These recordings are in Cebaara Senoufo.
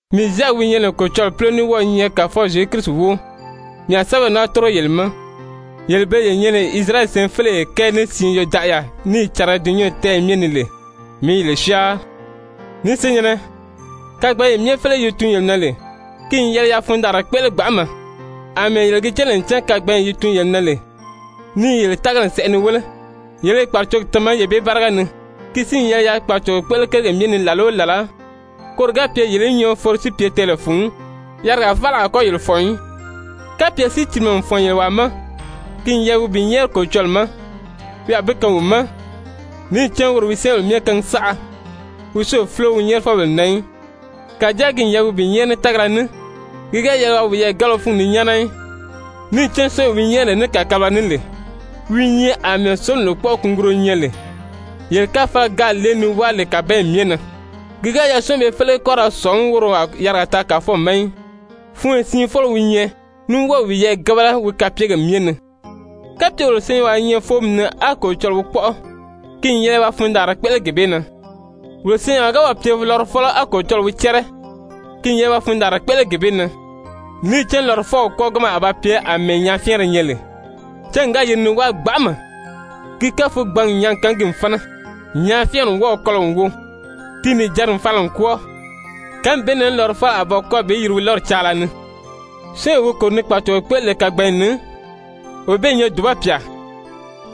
Mii Zyaki wi nyɛ lè Kolocɔlɔɔ púlo ní wɔ́ɔ i nyɛ Kàfɔw Zyezu Kirisi wóo, mii a sɛ́bɛw naa tórigo yele ma, yele bele ye nyɛ lè Isirayɛli syɛɛnfeleyi kɛɛ ní siin yodaʔaya níì cariga dulunyanw tɛ́ɛyɛ myɛ ni lè, mii i yele syáanri! Ni senyɛ̀nnɛ, kagbanyee myɛ féleye yi tuun yele na lè, ki n yɛlɛ yaa fundaanra kpéʔele gbanʔama, àmɛɛ yele gi cán lè ncan kagbanyee yi tuun yele na lè ni yele tágali sɛʔɛ ni wéle, yele i kpàracogi tama yee bee báriga ni. Ki si n yɛlɛ yaa kpàracogo kpéʔele kérigèle myɛ ni làla o làla, koro ga pye yele í nyɔɔ foro si pye tɛɛlɛ fun, yarigaa faala a kɔ́ yele fɔ̀n í. Kapye sícilimɛ n fɔ̀n yele wàa ma, ki n yɛlɛ wi bi nyɛ́ɛri Kolocɔlɔɔ ma, wi a bi kaan wi ma, níì cán woro wi syɛ́ɛnbèle myɛ kaangi saʔa, wi si o fúlo wi nyɛ́ɛrifɔbèle na í. Kàjáa ki n yɛlɛ wi bi nyɛ́ɛri ní tágala ní, ki ga yɛlɛ waa wiyɛɛ gábala wi fúngi ni nyáana í. Níì cán syɔ́ɔnwee wi nyɛ́ɛri ní kàkabalaga ní lè, wi i nyɛ àmɛɛ sólomi lòkpɔʔɔ kunguruyo nyɛ lè, yee káfalagi gáā lée ni wáa lè kàbanyi myɛ na. Ki ga yɛlɛ syɔ́ɔnw bee félege í kɔ́ ra sɔ̀ngí woro a yarigaa taa Kàfɔw ma í, funyo siin fɔ́lɔ wi nyɛ, ní wɔ́ɔ i wiyɛɛ gábala wi kapyegèle myɛ ni. Kapye wolo senyɛnwaa i nyɛ fóomi ni á Kolocɔlɔɔ wi kpɔ́ʔɔ, ki n yɛlɛ waa fundaanra kpéʔele gee bee na. Wolo senyɛnwaa ga wɔ́ɔ̀ pye lɔrɔfɔlɔ á Kolocɔlɔɔ wi cɛ́rɛ, ki n yɛlɛ waa fundaanra kpéʔele gee bee na. Níì cán lɔrɔfɔw kwɔ́ɔganma a ba pye àmɛɛ nyàáfyɛɛnri nyɛ lè. Cángi ga yiri ni wáa gbanʔama, ki káfugbangi n nyàági kaan ki n fána. Nyàáfyɛɛnri n wɔ́ɔ̀ kɔlɔ n wo, ti nìjanri n fala n kwɔ́ɔ. Kánmi bee na lɔrɔfɔlɔ a ba kwɔ́ɔ bi yiri wi lɔ́ri caala ni. Syɔ́ɔnwee wi kòro ni kpàracogo kpéʔele lè kagbanyi ni, wee bee i nyɛ dùba pyà.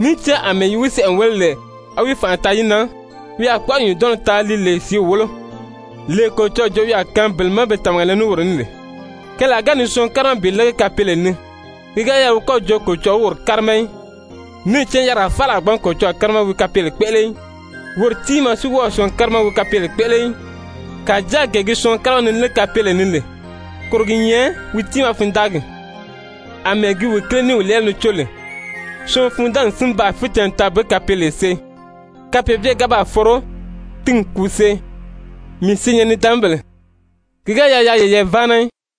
Níì cán àmɛɛ yi wi sɛʔɛ n wéle lè á wi fànʔa taa yi na, wi a kpɔ́ʔɔri nyùndɔnnɔ taa li lè sìíw wólo, lee Kolocɔlɔɔ joo wi a kaan bele má be tàmaga le ní woro ní lè. Keelaa ga ni syɔɔn kárima bi lége kapeele ni, ki ga yɛlɛ wi kɔ jo Kolocɔlɔɔ wi woro kárima í. Níì cán yarigaa faala a gbǎn Kolocɔlɔɔ kárima wi kapeele kpéʔele í, woro tiimaa si wɔ́ɔ o syɔɔn kárima wi kapeele kpéʔele í. Kàjáa gee gi syɔɔn kárima ni légi kapeele ni lè, koro gi nyɛ wi tiimaa fundaagi, àmɛɛ gi wi kíle ní i wi lɛ́ɛlɛ ni có lè. Syɔɔn fundaagi n si baa ficɛnnɛ taa bi kapeele see. Kapeebyeri ga baa foro, ti n kùu see. Mii senyɛn-nidaanmabèle, ki ga yɛlɛ yaa yeyɛɛ váana í,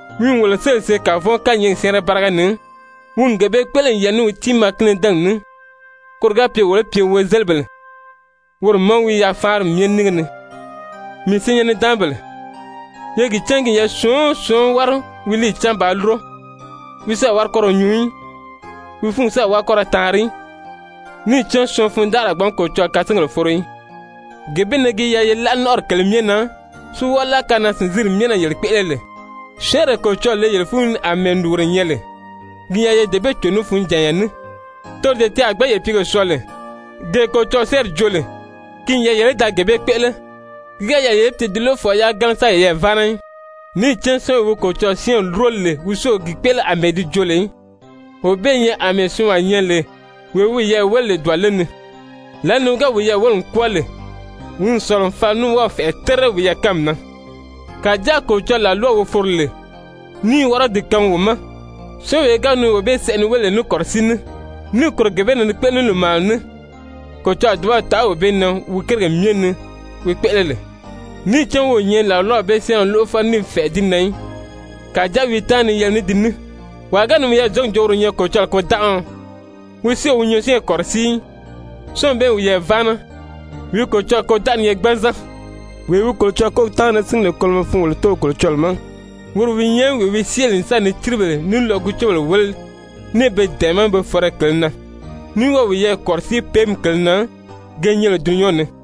Wi n wolo séli n see kavɔn kányɛɛgi syɛ́ɛnrɛ báriga ni, wi n gee bee kpéʔele n yɛlɛ ní wi tiimaa kínidɛnɛgi ní, koro ga pye wolo í pye wozelibèle woro ma wi yafaanri myɛ nínge ni. Mii senyɛn-nidaanmabèle, ye gi cán ki n yɛlɛ syɔɔn o syɔɔn í wári wi líiyi cáan bàā lúro, wi si a wári kɔ́ ra nyuu í, wi fúngi si a wári kɔ́ ra taanri í, níì cán syɔɔn fundanʔari a gbǎn Kolocɔlɔɔ kasingèle foro í. Gee bee na gi yɛlɛ ye láʔa nɔ́nʔɔri kèlē myɛ na si wɔ́ɔ láʔa kanaa-sìnzinri myɛ na yele kpéʔele lè, syɛ́ɛnree Kolocɔlɔɔ le yele fúnyi ni àmɛɛ lùguro nyɛ lè, ki n yɛlɛ ye dee bee cò ní funjànya ní, toro dee ti a gbǎn yele pìígèle syɔɔ lè. Gee Kolocɔlɔɔ syɛ́ɛnri joo lè, ki n yɛlɛ yele í da gee bee kpéʔele, ki ga yɛlɛ yele í pye ti lóʔofɔbèle yagana sáā yeyɛɛ váana í. Níì cán syɔ́ɔnwee wi Kolocɔlɔɔ syɛ́ɛnri lúro lè wi si o gi kpéʔele àmɛɛ di joo lè í, wee bee i nyɛ àmɛɛ syɔɔnwaa nyɛ lè wee wi wiyɛɛ wéle lè dùbale ni, lǎli ni wi ga wiyɛɛ wéle n kwɔ́ɔ lè, wi n sɔ̀lɔ n fala ní wɔ́ɔ̀ fɛ̀ʔɛ terire wiyɛɛ kánmi na. Kàjáa Kolocɔlɔɔ làlwaw wi foro lè ní i wɔ́rɔdi kaangi wo ma, syɔ́ɔnwee ga ni wee bee sɛʔɛ ni wéle lè ní kɔ̀rɔsíi ní, níì kòro gee bee na ni kpéʔele ní lòmaana ní, Kolocɔlɔɔ a dùbaw taʔa wee bee na wi kérigèle myɛ ni wi kpéʔele lè, níì cán wi o nyɛ làlwaw bee syɛ́ɛnrɛ lóʔofɔlɔ ní i fɛ̀ʔɛ́ di na í, kàjáa wi i táanri ni yɛlɛgi ní di ní. Wàa ga ni wiyɛɛ zɔ̀ngí n jo woro i nyɛ Kolocɔlɔɔ kôdanʔaɔ, wi si o wi nyɔɔsyɛɛnri kɔ̀rɔsíi í, syɔ́ɔnw bee i wiyɛɛ váana, wi Kolocɔlɔɔ kôdanʔari i nyɛ gbanzan. Wee wi Kolocɔlɔɔ kólogi táanri ni síngi lè kolomɔ fun wolo Tóow Kolocɔlɔɔ ma, woro wi nyɛ wee wi syée lè n sa ni círibèle ní lɔgucebèle wéle ní i be dɛ̀ɛmɛ́ pe fɔ̀rɔyi kèlē na, ní wɔ́ɔ i wiyɛɛ kɔ̀rɔsíi péemi kèlē na ge nyɛ lè dulunyanw ni.